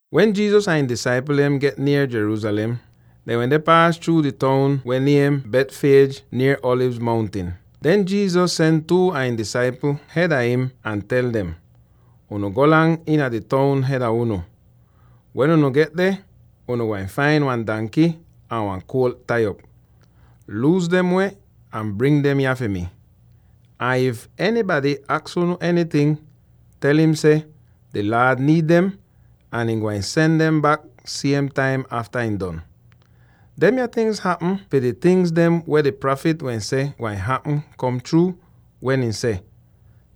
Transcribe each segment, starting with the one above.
Wen Jesus ahn ihn disaipl dem get nier Jerusalem, dehn wende paas chruu di toun weh niem Bethphage nier Alivz Mountin. Den Jesus sen two a ihn disaipl hed a im, ahn ihn tel dem, “Unu golang iina di toun hed a unu. Wen unu get deh, unu gwain fain wan danky ahn wan kuolt tai op. Luus dem weh ahn bring dem yah fi mi. Ahn if enybady aks unu enyting, tel im seh, ‘Di Laad niid dem, ahn ihn gwain sen dem bak siem taim afta ihn don.’” Demya tingz hapm fi di tingz dem weh di prafit wehn seh gwain hapm kom chruu, wen ihn seh,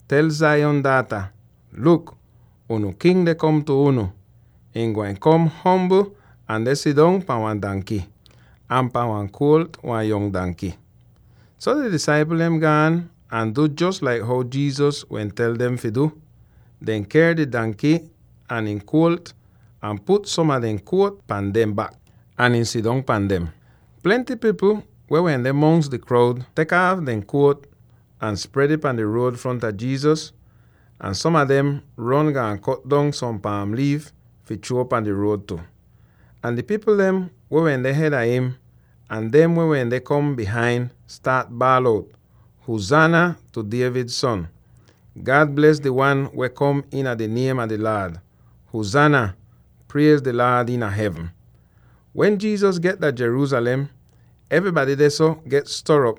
“Tel Zion daata, ‘Luk, fi unu King deh kom tu unu; ihn gwain kom ombl ahn deh sidong pahn wan danky, ahn pahn wan kuolt, wan yong danky.’” So di disaipl dem gaan ahn du jos laik how Jesus wehn tel dem fi du. Dehn ker di danky ahn ihn kuolt ahn put som a dehn jakit pan dehn bak, ahn ihn sidong pan dem. Plenty pipl weh wende mongs di kroud tek aaf dehn jakit ahn spred ih pahn di ruod fronta Jesus. Ahn som a dem ron gaan kot dong som paam liif fi chruo pan di ruod tu. Ahn di pipl dem weh wende hed a him, ahn dem weh wende kom bihain, staat baal out: “Huzaana tu David Son! God bles di wan weh kom iina di niem a di Laad! Huzaana! Priez di Laad iina hevn!” Wen Jesus get dah Jerusalem, evrybady dehso get stor'op,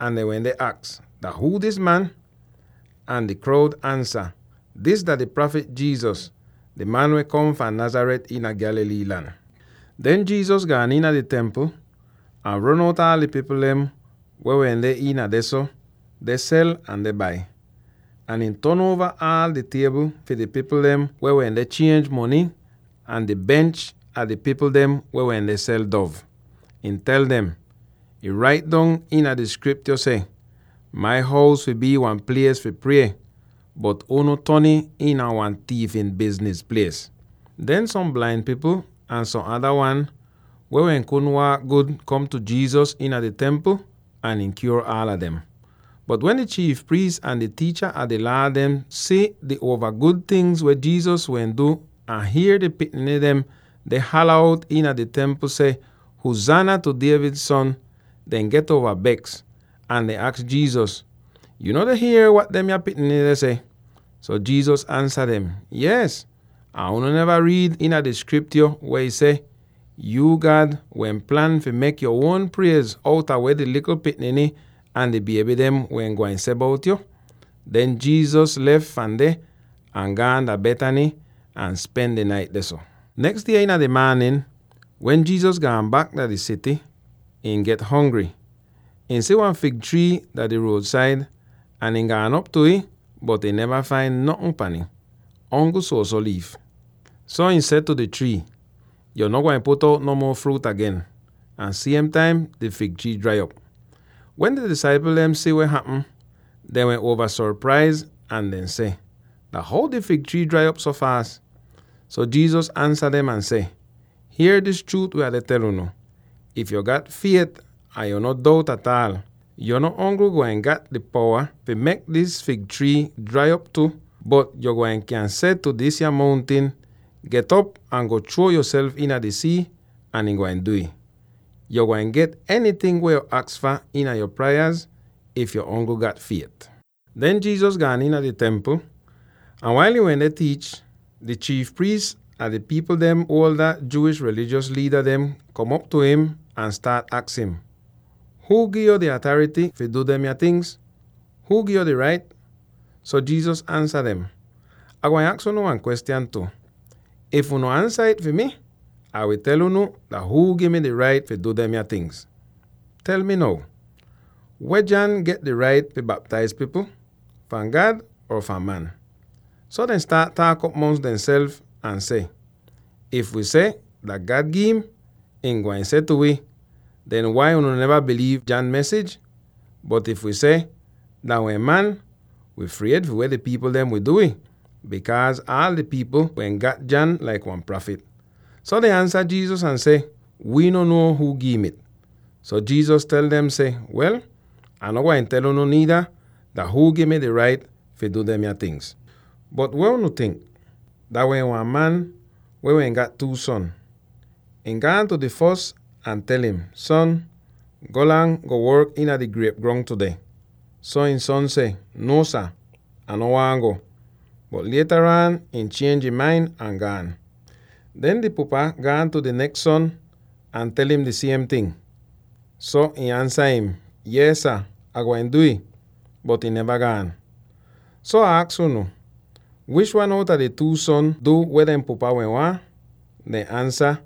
ahn dehn wende aks, “Dah huu dis man?” Ahn di kroud ansa, “Dis dah di prafit Jesus, di man weh kom fahn Nazareth iina Galilee lan.” Den Jesus gaan iina di Templ, ahn ron out aal di pipl dem weh wende iin dehso, deh sel ahn deh bai. Ahn ihn ton uova aal di tiebl fi di pipl dem weh wende chienj mony ahn di bench a di pipl dem weh wende sel dov. Ihn tel dem, “Ih rait dong iina di Skriptyo seh, ‘Mai hous fi bii wan plies fi prie,’ bot unu ton ih iina wan tiifin bizniz plies!” Den som blain pipl ahn som ada wan weh kudn waak gud kom tu Jesus iina di Templ, ahn ihn kyuor aala dem. Bot wen di chiif priis ahn di tiicha a di Laa dehn si di uova gud tingz weh Jesus wehn du ahn hier di pikniny dem deh hala out iina di Templ seh, “Huzaana tu David son,” dehn get uova beks; ahn dehn aks Jesus, “Yuu no deh hier wat demya pikniny deh seh?” So Jesus ansa dem, “Yees! Ahn unu neva riid iina di Skriptyo weh ih seh, ‘Yuu, God, wehn plan fi mek yo uon priez outa weh di likl pikniny ahn di bieby dem wehn gwain seh bout yo.’” Den Jesus lef fahn deh ahn gaan dah Bethany ahn spen di nait dehso. Neks die iina di maanin, wen Jesus gaan bak dah di sity, ihn get hongry. Ihn si wan fig trii dah di ruod-said, ahn ihn gaan op tu ih, bot ihn neva fain notn pahn ih, ongl suoso liif. So ihn seh tu di trii, “Yo no gwain put out no muo fruut agen!” Ahn siem taim di fig trii drai op! Wen di disaipl dem si weh hapm, dehn wehn uova sopraiz ahn dehn seh, “Dah how di fig trii drai op so faas?” So Jesus ansa dem ahn seh, “Hier dis chruut weh Ah deh tel unu: if yo gat fiet ahn yo no dout ataal, yo no ongl gwain gat di powa fi mek dis fig trii drai op tu, bot yo gwain kyan seh tu disya mountin, ‘Get'op ahn go chruo yoself iina di sii,’ ahn ih gwain du'ih. Yo gwain get enyting weh yo aks fah iina yo prayaz, if yo ongl gat fiet.” Den Jesus gaan iina di Templ. Ahn wail ihn wende tiich, di chiif priis ahn di pipl dehn Jewish rilijos liida dehn kom op tu im ahn staat aks im, “Huu gi'yo di atarity fi du demya tingz? Huu gi'yo di rait?” So Jesus ansa dem, “Ah gwain aks unu wan kwestyan tu. If unu ansa it fi mi, Ah wi tel unu dah huu gi mi di rait fi du demya tingz. Tel mi now: weh John get di rait fi baptaiz pipl? Fahn God or fahn man?” So dehn staat taak'op mongs demself ahn seh, “If wi seh, ‘Dah God gi'im,’ ihn gwain seh tu wi, ‘Den wai unu neva biliiv John mesij?’ Bot if wi seh, ‘Dah wehn man,’ wi fried fi weh di pipl dem wi du wi, bikaaz aal di pipl dehn wehn gat John laik wan prafit.” So dehn ansa Jesus ahn seh, “Wii no nuo huu gi'im it.” So Jesus tel dem seh, “Wel, Ah no gwain tel unu niida dah huu gi mi di rait fi du demya tingz.” “Bot weh unu tink? Dah wehn wan man weh wehn gat two son. Ihn gaan tu di fos ahn tel im, ‘Son, golang, go work iina di griep grong tudeh.’ So ihn son seh, ‘Nuo sah, Ah no waahn go,’ bot lietaraan ihn chienj ihn main ahn gaan. Den di pupa gaan tu di neks son ahn tel im di siem ting. So ihn ansa im, ‘Yees sah, Ah gwain du'ih,’ bot ihn neva gaan. So Ah aks unu: Wish wan outa di two son du weh dehn pupa wehn waahn?” Dehn ansa,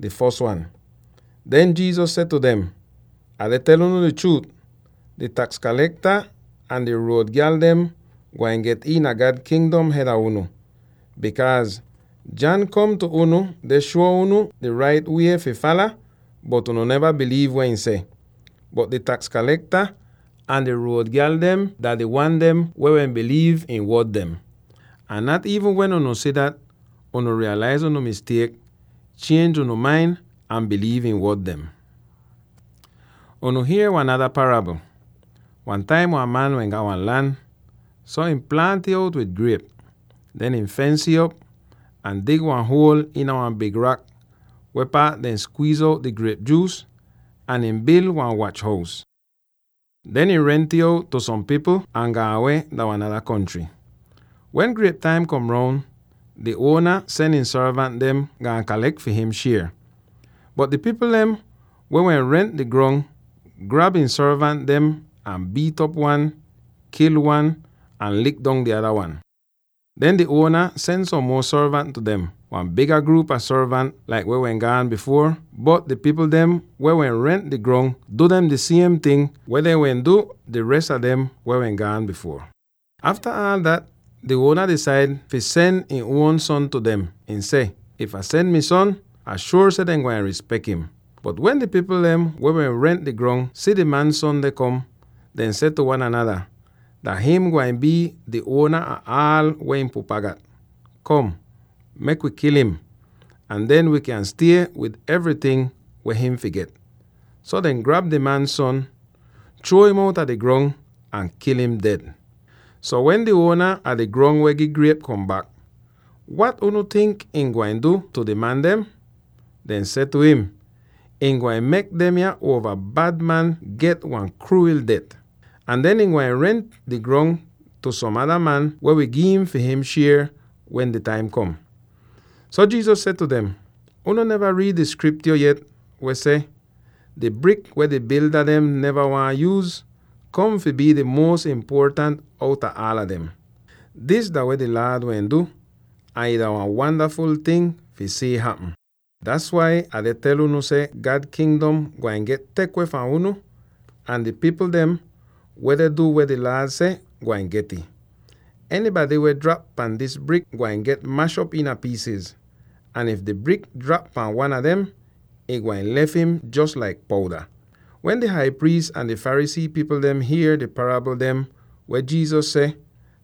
“Di fos wan.” Den Jesus seh tu dem, “Ah deh tel unu di chruut: di taks kalekta ahn di ruod gyal dem gwain get iina God Kingdom hed a unu. Bikaaz John kom tu unu deh shuo unu di rait wie fi faala, bot unu neva biliiv weh ihn seh. Bot di taks kalekta ahn di ruod gyal dem dah di wan dem weh wehn biliiv ihn wod dem. Ahn nat iivn wen unu si dat, unu riiyalaiz unu mistiek, chienj unu main ahn biliiv ihn wod dem tu. “Unu hier wan nada parabl: Wan taim wan man wehn gat wan lan, so ihn plaant ih out wid griep. Den ihn fens'ih op, ahn dig wan huol iina wan big rak, weh paat dehn skwiiz out di griep juus, ahn ihn bil wan wach-hous. Den ihn rent'ih out tu som pipl ahn gaan weh dah wan nada kontry. Wen griep taim kom roun, di uona sen ihn sorvant dem, gaan kalek fi him shier. Bot di pipl dem weh wehn rent di grong grab ihn sorvant dem ahn biit'op wan, kil wan, ahn lik dong di nada wan. Den di uona sen som muo sorvant tu dem, wan biga gruup a sorvant laik dem weh wehn gaan bifuor, bot di pipl dem weh wehn rent di grong du dem di siem ting weh dehn wehn du di res a dem weh gaan bifuor. Afta aal dat, di uona disaid fi sen ihn uon son tu dem. Ihn seh, ‘If Ah sen mi son, Ah shuor seh dehn gwain rispek him.’ Bot wen di pipl dem weh rent di grong si di man son deh kom, dehn seh tu wan anada, ‘Dah him gwain bii di uona ah aal weh ihn pupa gat. Kom, mek wi kil im, ahn den wi kyan stie wid evryting weh him fi get!’ So dehn grab di man son, chruo im outa di grong, ahn kil im ded. “So wen di uona a di grong weh gi griep kom bak, wat unu tink ihn gwain du tu di man dem?” Dehn seh tu im, “Ihn gwain mek demya uova bad man get wan kruwil det. Ahn den ihn gwain rent di grong tu som ada man weh wi gi'im fi him shier wen di taim kom.” So Jesus seh tu dem, “Unu neva riid di Skriptyo yet, weh seh: ‘Di brik weh di bilda dem neva waahn yuuz, kom fi bii di muos impuotant outa aala dem! Dis dah weh di Laad wehn du, ahn ih dah wan wandaful ting fi si'ih hapm!’ Das wai Ah deh tel unu seh God Kingdom gwain get tek weh fahn unu; ahn di pipl dem, weh deh du weh di Laad seh, gwain get'ih. Enybady weh drap pan dis brik gwain get mash'op iina piisiz, ahn if di brik drap pan wan a dem, ihn gwain lef im jos laik pouda.” Wen di hai priis ahn di Pharisee pipl dehn hier di parabl dem weh Jesus seh,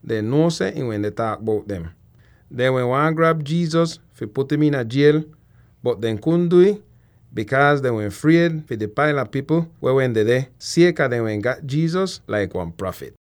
dehn nuo seh ihn wende taak bout dem. Dehn wehn waahn grab Jesus fi put im iina jiel. Bot dehn kudn du'ih, bikaaz dehn wehn fried fi di paila pipl weh wehn dedeh, sieka dehn wehn gat Jesus laik wan prafit.